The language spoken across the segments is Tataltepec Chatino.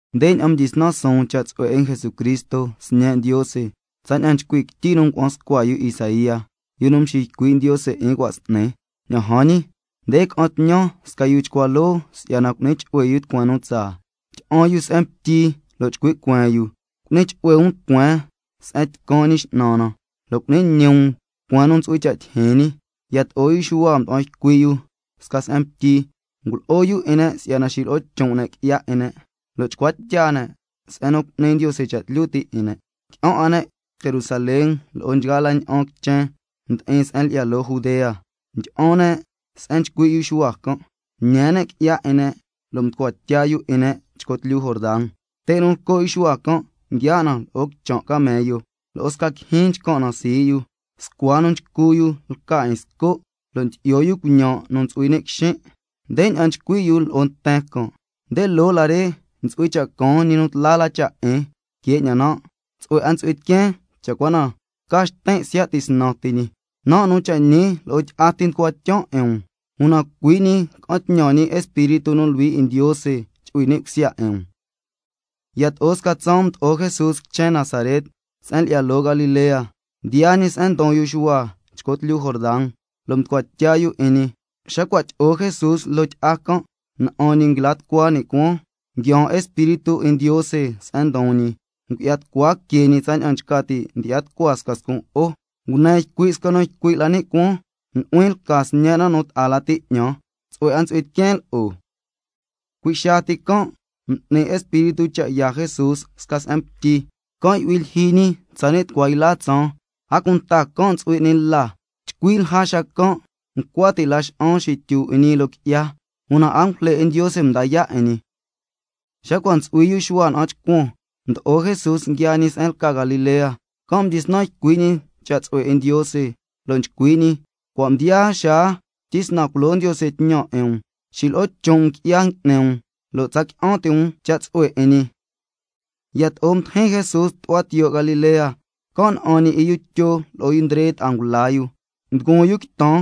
Ndeña'an mdyisnan suun cha' tsu'hue 'in Jesucristo, Sñe' Ndiose, tsaña'an nchcui' quityi nu ngua'an scua yu Isaía, yu nu mxiycui' Ndiose 'in cua' s'ni: —Ña'an jan ñi, nde ca'an tñan sca yu chcua loo si'yana cu'ni chu'hue yu tucueen nu caan. Tyi'an yu se'en ngutyi lo' chcui' cueen yu: Cu'ni chu'hue um tucueen se'en caan Ñi X'nan na, lo' cu'ni ñi um tucueen nu ntsu'hui cha' tyijyin ñi—. Yato'o yu Xuhua mda'an ycui' yu sca se'en ngutyi, ngulo'o yu 'in ne' si'yana xilo'o chon' ne' qui'ya 'in ne' lo' chcua tya ne', ña'an ca si'yana cu'ni Ndiose cha' tlyu ti' 'in ne'. Qui'an 'a ne' Jerusalén lo'o nchgaa la ña'an quichen ndi'in se'en lyi'ya loo Judea, ndyi'an ne' se'en nchcui' yu Xuhua can', ñee ne' qui'ya 'in ne' lo' mducua tya yu 'in ne' chco tlyu Jordan. Te' nu nchco' yu Xuhua can' nguiaa' na lo'o quichan' camello, lo'o sca quijyin nchcan' na sii' yu. Scua nu nchcu yu lca 'in sco', lo' ndyi'yo yu cuiñan' nu ntsu'hui ni' quixin'. Ndeña'an nchcui' yu lo'o nten can': Nde loo la re ntsu'hui cha' caan ñi nu tla la cha' 'in que 'ñan nan'. Tsu'hue 'a ntsu'hui tiqueen cha' cua na tca xtin' siya' tisnan ti ñi. Nan' nu cha' ñi lo'o tyi'a ti nducuan tyan 'in um, una cui' ñi ca'an tñan ñi Espíritu nu Luhui 'in Ndiose chu'hui ni' cusya 'in um. Yato'o sca tsaan mdo'o Jesús quichen Nazaret se'en lyi'ya loo Galilea, mdiyaa ñi se'en ndon yu Xuhua chco tlyu Jordan, lo' mducua tya yu 'in ñi. Xa cua' tyi'o Jesús loo tyi'a can', na'an ñi nguila tucua ni' cuaan, nguiaan Espíritu 'in Ndiose se'en ndon ñi, ngu'ya tucua que ñi tsaña'an nchca ti' ndyi'ya tucua sca scun' jo'o. Ngune ycui' sca nu ycui' la ni' cuaan: Nu'huin lca Sñen' nan' nu ta'a lati 'ñan, tsu'hue 'a ntsu'hui tiqueen lo'o. Cui' xaa ti can' m'ni Espíritu cha' yaa Jesús sca se'en ngutyi. Can' yu'hui lyijyi ñi tsani' tucua yla tsaan, a cunta can' ntsu'hui 'ni la. Chcui lja xacan' ncua ti' laxa'an xityu 'in ñi loo qui'ya, una angujle 'in Ndiose mda yaa' 'in ñi. Xa cua' ntsu'hui yu Xuhua na'an chcuan, mdo'o Jesús nguiaa ñi se'en lca Galilea, can' mdyisnan ycui' ñi cha' tsu'hue 'in Ndiose, lo' nchcui' ñi: Cua' mdiyaa xaa tyisnan culo Ndiose tñan 'in um. Xilo'o chon' um qui'ya ngui'ni um lo' tsa qui'an ti' um cha' tsu'hue 'in ñi. Yato'o mdijin Jesús tu'hua tiyo' Galilea, can' na'an ñi 'in yu Tyo lo'o yu Ndre ta'a ngula yu, nduguun yu quitan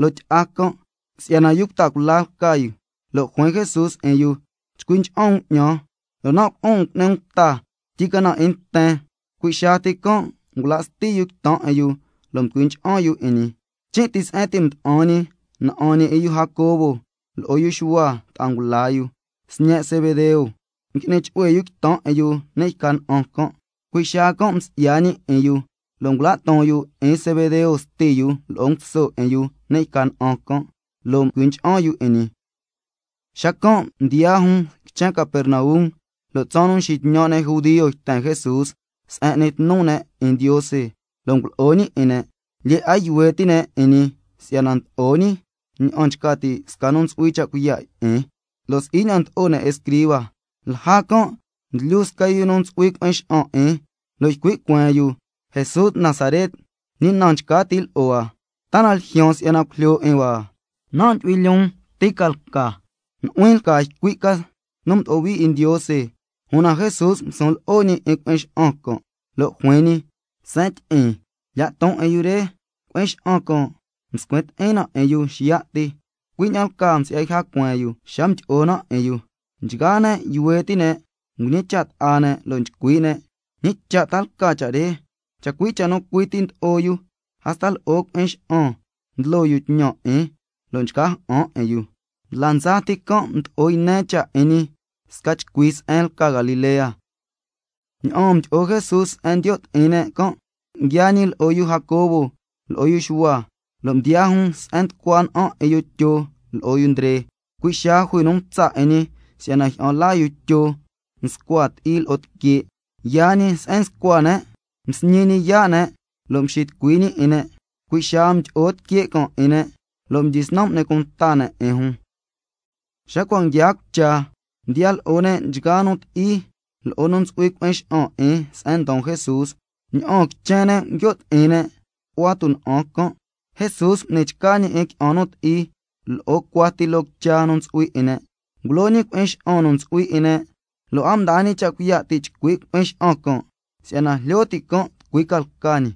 loo tyi'a can' si'yana yu cuta cula lca yu. Lo' juin Jesús 'in yu: Chcui ncha'an um 'ñan, lo' nan' culo'on 'in um cu'ni um cuta, tyicana 'in nten. Cui' xaa ti can' ngula' sti yu quitan 'in yu lo' mducui ncha'an yu 'in ñi. Chin' ti se'en ti' mda'an ñi, na'an ñi 'in yu Jacobo lo'o yu Xuhua ta'a ngula yu, sñe' Zebedeo, ngui'ni chu'hue yu quitan 'in yu ni' yca na'an can'. Cui' xaa can' msi'ya ñi 'in yu, lo' ngula' ton yu 'in Zebedeo sti yu lo'o nguso 'in yu ni' yca na'an can', lo' mducui ncha'an yu 'in ñi. Xacan' mdiyaa jun quichen Capernaum, lo' tsaan nu nxitñan' ne' judio yten Jesús se'en n'ni tnu ne' 'in Ndiose, lo' ngulo'o ñi 'in ne'. Lyee 'a yuhue ti' ne' 'in ñi si'yana ndlo'o ñi ña'an nchca ti' sca nu ntsu'hui cha' cuiya' 'in, lo' si'i ña'an ndlo'o ne' escriba. Lja can' nguilyu sca yu nu ntsu'hui cui'in xa'an 'in, lo' ycui' cueen yu: Jesús Nazaret, ¿ñi na nchca ti' lo'o hua? ¿Ta na ljyaan si'yana cujlyo 'in hua? Nan' ndyu'huin lyoon ti ca lca, nu'huin lca ycui' ca nu mdo'o hui 'in Ndiose. Una Jesús ngusun lo'o 'in cui'in xa'an can', lo' juin ñi: Seen tyi'in, lya' ton 'in yu re. Cui'in xa'an can' mscuin ti'in na 'in yu xiya' ti, cui' ña'an lcaa msi'ya yja cueen yu xa mdyi'o na 'in yu. Nchgaa ne' yuhue ti' ne', mñicha' ta'a ne' lo' nchcui' ne': ¿Ñi cha' ta lca cha' re? Chacui' cha' nu cui ti ndlo'o yu, hasta lo'o cui'in xa'an ndlo yu tñan 'in, lo' nchca ja'an 'in yu. Ndla ndsa ti can' mdo'o yne cha' 'in ñi sca chcui se'en lca Galilea. Ña'aan mdyi'o Jesús se'en ndiyo' ti'in ne' can', nguiaa ñi lo'o yu Jacobo lo'o yu Xuhua, lo' mdiyaa jun se'en nducua na'an 'in yu Tyo lo'o yu Ndre. Cui' xaa jui nu mtsa' 'in ñi si'yana jyi'an laa yu Tyo nscua ti'i lo'o tique'. Xacan' yaa ñi se'en nscua ne', msñi ñi yaa' ne' lo' mxitucui ñi 'in ne'. Cui' xaa mdyi'o tique' can' 'in ne', lo' mdyisnan m'ni cunta ne' 'in jun. Xa cua' nguiaa cucha, mdiya lo'o ne' nchgaa nu ti'i lo'o nu ntsu'hui cui'in xa'an 'in se'en ndon Jesús, ña'aan quichen ne' nguio' ti'in ne' tu'hua tuna'an can'. Jesús m'ni chca ñi 'in qui'an nu ti'i lo'o cuati loo quicha nu ntsu'hui 'in ne', ngulo ñi cui'in xa'an nu ntsu'hui 'in ne', lo' a mdaa ñi cha' cuiya' ti' chcui' cui'in xa'an can' si'yana jlyo ti' can' tucui ca lca ñi.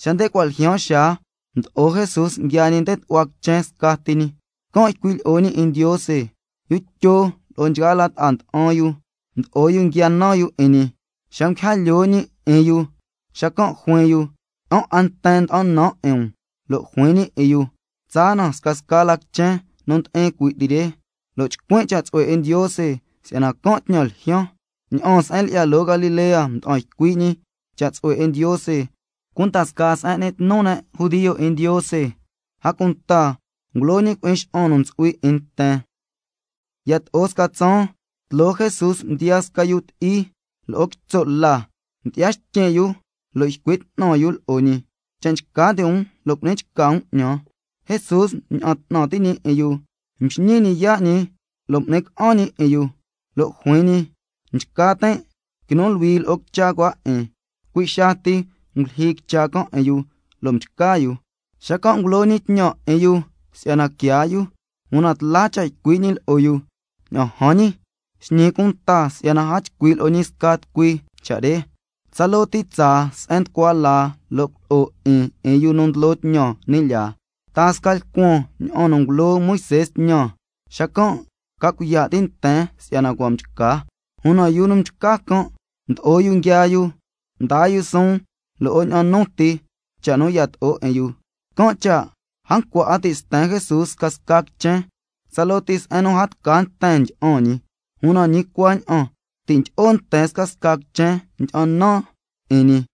Xa nde cua' ljyaan xaa, mdo'o Jesús nguiaa ñi nde tu'hua quichen scati ñi, can' nchcui' lyi'o ñi 'in Ndiose. Yu Tyo lo'o nchgaa la ta'a nda'an yu, mdo'o yu nguia nan yu 'in ñi. Xa nguija lyoo ñi 'in yu, xacan' juin yu: Qui'an 'a nten nda'an nan 'in um. Lo' juin ñi 'in yu: Tsaa na scasca la quichen nu ndi'in cui' ti re, lo' chcuin' cha' tsu'hue 'in Ndiose, si'yana can' tñan ljyaan. Ña'aan se'en lyi'ya loo Galilea mda'an ycui' ñi cha' tsu'hue 'in Ndiose cunda scaa se'en n'ni tnu ne' 'in Ndiose, a cunta ngulo ñi cui'in xa'an nu ntsu'hui 'in nten. Yato'o sca tsaan, tloo Jesús mdiyaa sca yu ti'i lo'o quitso' la. Mdyi'ya xtyin' yu lo' ycui' 'tnan yu lo'o ñi: Cha' nchca ti' um lo' cu'ni chca um 'ñan. Jesús mña'an 'tnan ti' ñi 'in yu, mxñii ñi yaa' ñi lo' m'ni ca'an ñi 'in yu, lo' juin ñi: Nchca tin'. Quinu luhui lo'o quicha cua 'in. Cui' xaa ti ngulyijyi quicha can' 'in yu, lo' mchca yu. Xacan' ngulo ñi tñan 'in yu si'yana quiaa yu, una tla cha' ycui' ñi lo'o yu: Ña'an jan ñi, xñi cunta si'yana a chcui' lo'o ñi sca tucui cha' re. Tsaloo ti tsaa se'en nducua laa lo' culo'o 'in 'in yu nu ndlo tñan ni' lyaa, taa sca lcuan ña'an nu ngulo Moisé tñan, xacan' ca cuiya' ti' nten si'yana cua' mchca. Una yu nu mchca can' mdo'o yu nguiaa yu, mdaa yu suun lo'o ña'an nu ti cha' nu yato'o 'in yu. Can' cha' a ncua 'a ti' sten Jesús scasca quichen, tsaloo ti se'en nu a tca nten ndyi'an ñi, una ñi cuaña'an ti' ndyi'o nten scasca quichen ndyi'an nan 'in ñi.